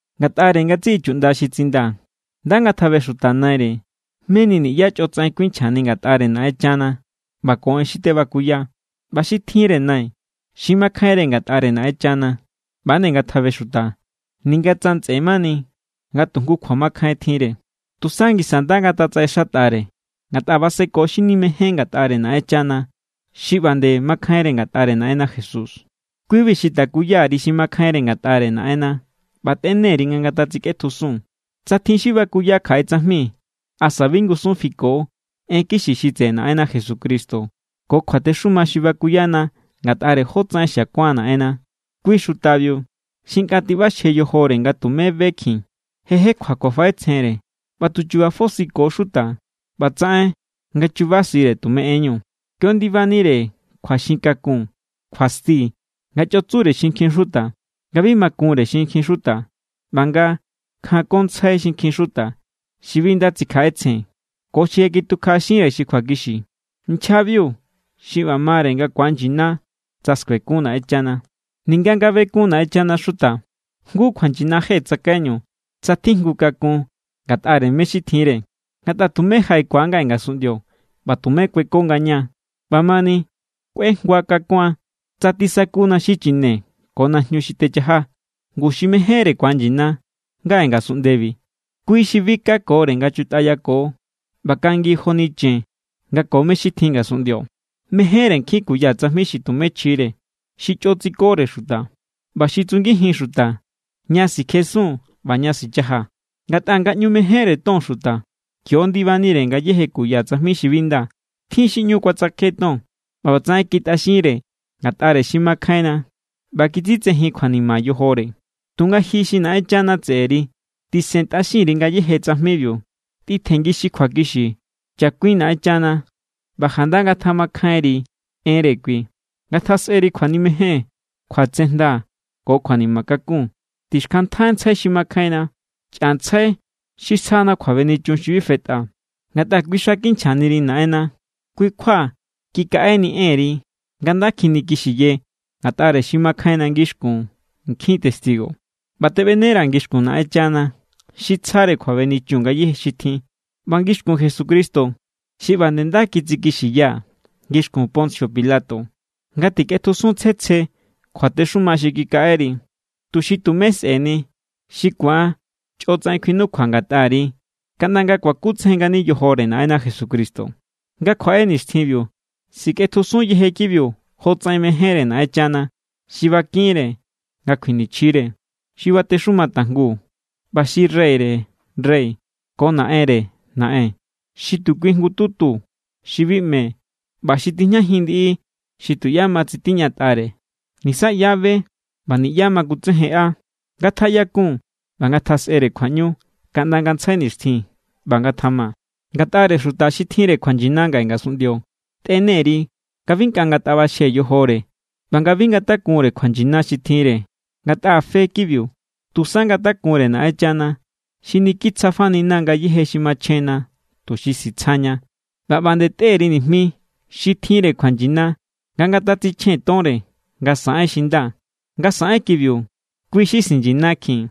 Ngatꞌare ngatsiꞌi chuꞌnda xi tsindaa̱, nda ngatjabexuta naire meni niꞌyá chꞌotsaꞌen kjuinchjani ngatꞌare Naꞌenchana ꞌba ko en xi tebakuya. ꞌBa xi tjinre nai xi makjainre ngatꞌare Naꞌenchana, ꞌba=nde ngatjabexuta, ninga tsa ntsꞌe mani nga tu jngu kjuamakjain tjinre. Tusa ngisa nda ngatatsaꞌexatꞌare, ngatꞌa baseko xi nimején ngatꞌare Naꞌenchana xi ꞌba nde makjainre ngatꞌare Naꞌenna Jesús. Kui=bi xi takuya_ri xi makjainre ngatꞌare Naꞌenna ꞌba tꞌene_ri nga sikꞌetjusun. Tsa tjin xi bakuya kjaꞌe tsajmi asa bi ngusun fiko en kixi xi tseꞌe Naꞌenna Jesucristo ko kjuatexuma xi bakuyana ngatꞌare jótsaꞌen xiakuan Naꞌenna, kui xutabiu xi nkꞌa tiꞌbaxje yojore ꞌba tumé bekjin. Je jekjua kjuafaꞌetsjenre ꞌba tu chu̱ba̱ fosiko xuta ꞌba tsaꞌen nga chubasire tume enñu. Kio ndibanire kjuaxin kakun, kjuasti, nga chꞌo tsure xinkjin xuta, nga bi ma kunre xinkjin xuta, ꞌba nga kjankontsjai xinkjin xuta xi bi nda tsikjaꞌetsjen ko xi je kitukjaꞌaxinre xi kjuakixi. Nchjabiu xi ꞌba mare nga ku̱anyina tsa skuekun Naꞌenchana. Ninga nga bekun Naꞌenchana xuta, jngu kjuanyina je tsakaiñu tsa tjijngu kakun ngatꞌare mé= xi tjinre. Ngatꞌa tumé jaꞌekua ngaꞌe ngasunꞌndio ꞌba tumé kueko ngaña. ꞌBamani, kꞌuejngua kakuan tsa tisakuna xichine ko najñu xi techaja. Ngu xi mejénre ku̱anyina ngaꞌe ngasunꞌndebi, kui xi bi kakore nga chutꞌayako ꞌba kangi joni chen nga ko mé= xi tjin ngasunꞌndio. Mejénre nkjin kuya tsajmi xi tumé chjire, xi chꞌo tsikore xuta, ꞌba xi tsungijin xuta ña sikjesun ꞌba ña sichaja. Ngatꞌa nga ꞌñu mejénre ton xuta, kio ndibanire ngayéje kuya tsajmi xi bi nda. Tjin xi ꞌñu kuatsjake ton, ꞌba ꞌbatsaꞌen kitꞌaxinre ngatꞌare xi makjainna ꞌba kitsitsejin kjuanima yojore. Tunga ji xi Naꞌenchana tseꞌeri, tisentꞌaxin_ri ngayéje tsajmibiu. Tꞌitjengi xi kjuakixi, chakuin Naꞌenchana, ꞌba janda ngatjamakjainri enre kui. Ngatjasꞌeri kjuanimejen, kjuatsejnda ko kjuanima kakun. Tixkjantꞌantsjai xi makjainna. Chꞌantsjai xi sjana kjuabenichun xi bi fetꞌa, ngatꞌa kui xa kinchjaniri Naꞌenna. Kui= kjua kikaꞌeni enri nga nda kjinikixiye ngatꞌare xi makjainna ngixkun nkjin testigo. ꞌBa teꞌbenera̱ ngixkun Naꞌenchana xi tsjare kjuabenichun ngayéje xi tjin ꞌba ngixkun Jesucristo xi ꞌba nde nda kitsikixiya ngixkun Poncio Pilato nga tikꞌetjusun tsje tsje kjuatexuma xi kikaꞌeri, tuxi tumé sꞌe̱ni xi ku̱an chꞌotsaꞌen kjuinukjua ngatꞌari kaꞌnda nga kuakutsejen ngani yojore Naꞌenna Jesucristo. Nga kjuaꞌe nixtjinbiu, sikꞌetjusun yeje kibiu jotsaꞌen mejénre Naꞌenchana xi bakinre nga kjuinichjire, xi batexuma tajngu, ꞌba xi Reyre rey ko Naꞌenre naꞌen. Xi tu kui jngututu xi bi ꞌme ꞌba xi tijñajin ndiꞌi xi tuꞌyá ma tsitiñatꞌare. Nisa ꞌyá= be ꞌba niꞌyá ma kutsejenꞌa. ¡Ngatjaꞌyakun ꞌba ngatjasꞌere kjuaꞌñu kaꞌnda ngantsjai nixtjin! ꞌBa ngatjama. Ngatꞌare xuta xi tjinre kjuanyina ngaꞌe ngasunꞌndio, tꞌene_ri nga bi nkꞌa ngataꞌbaxje yojore ꞌba nga bi ngatakunre kjuanyina xi tjinre, ngatꞌa fe kibiu. Tusa ngatakunre Naꞌenchana xi niki tsjafanina= ngayéje xi machjenna tuxi sitsjaña. ꞌBa ꞌba nde tꞌe_ri nijmi xi tjinre kjuanyina nga ngatatsichjen tonre nga saꞌen xi nda. Nga saꞌen kibiu, kui= xi sinyinakjin.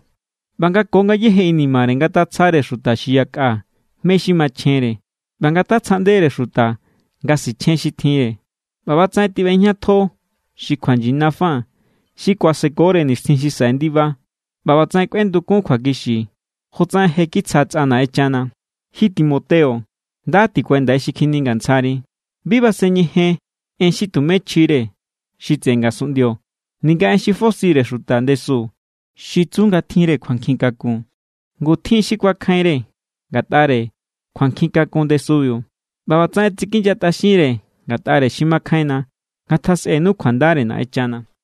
ꞌBa nga ko ngayéje inimare ngatatsjare xuta xi yakꞌa mé= xi machjenre ꞌba ngatatsjaꞌndere xuta nga sichjen xi tjinre. ꞌBa ꞌbatsaꞌen tiꞌbejñatjo xi kjuanyina fa xi kuasekore nixtjin xi saꞌe ndiba. ꞌBa ꞌbatsaꞌen kꞌuendukun kjuakixi jotsaꞌen je kitsja tsꞌa Naꞌenchana. Ji Timoteo, nda tikuendai xi kjiningantsjari. Bi basen ñejen en xi tumé chjire xi tseꞌe ngasunꞌndio ninga en xi fosire xuta ndesu xi tsu nga tjinre kjuankjin kakun. Ngu tjin xi kuakjainre ngatꞌare kjuankjin kakun ndesubiu ꞌba ꞌbatsaꞌen tsikinyatꞌaxinre ngatꞌare xi makjainna. Ngatjasꞌenu kjuandare Naꞌenchana.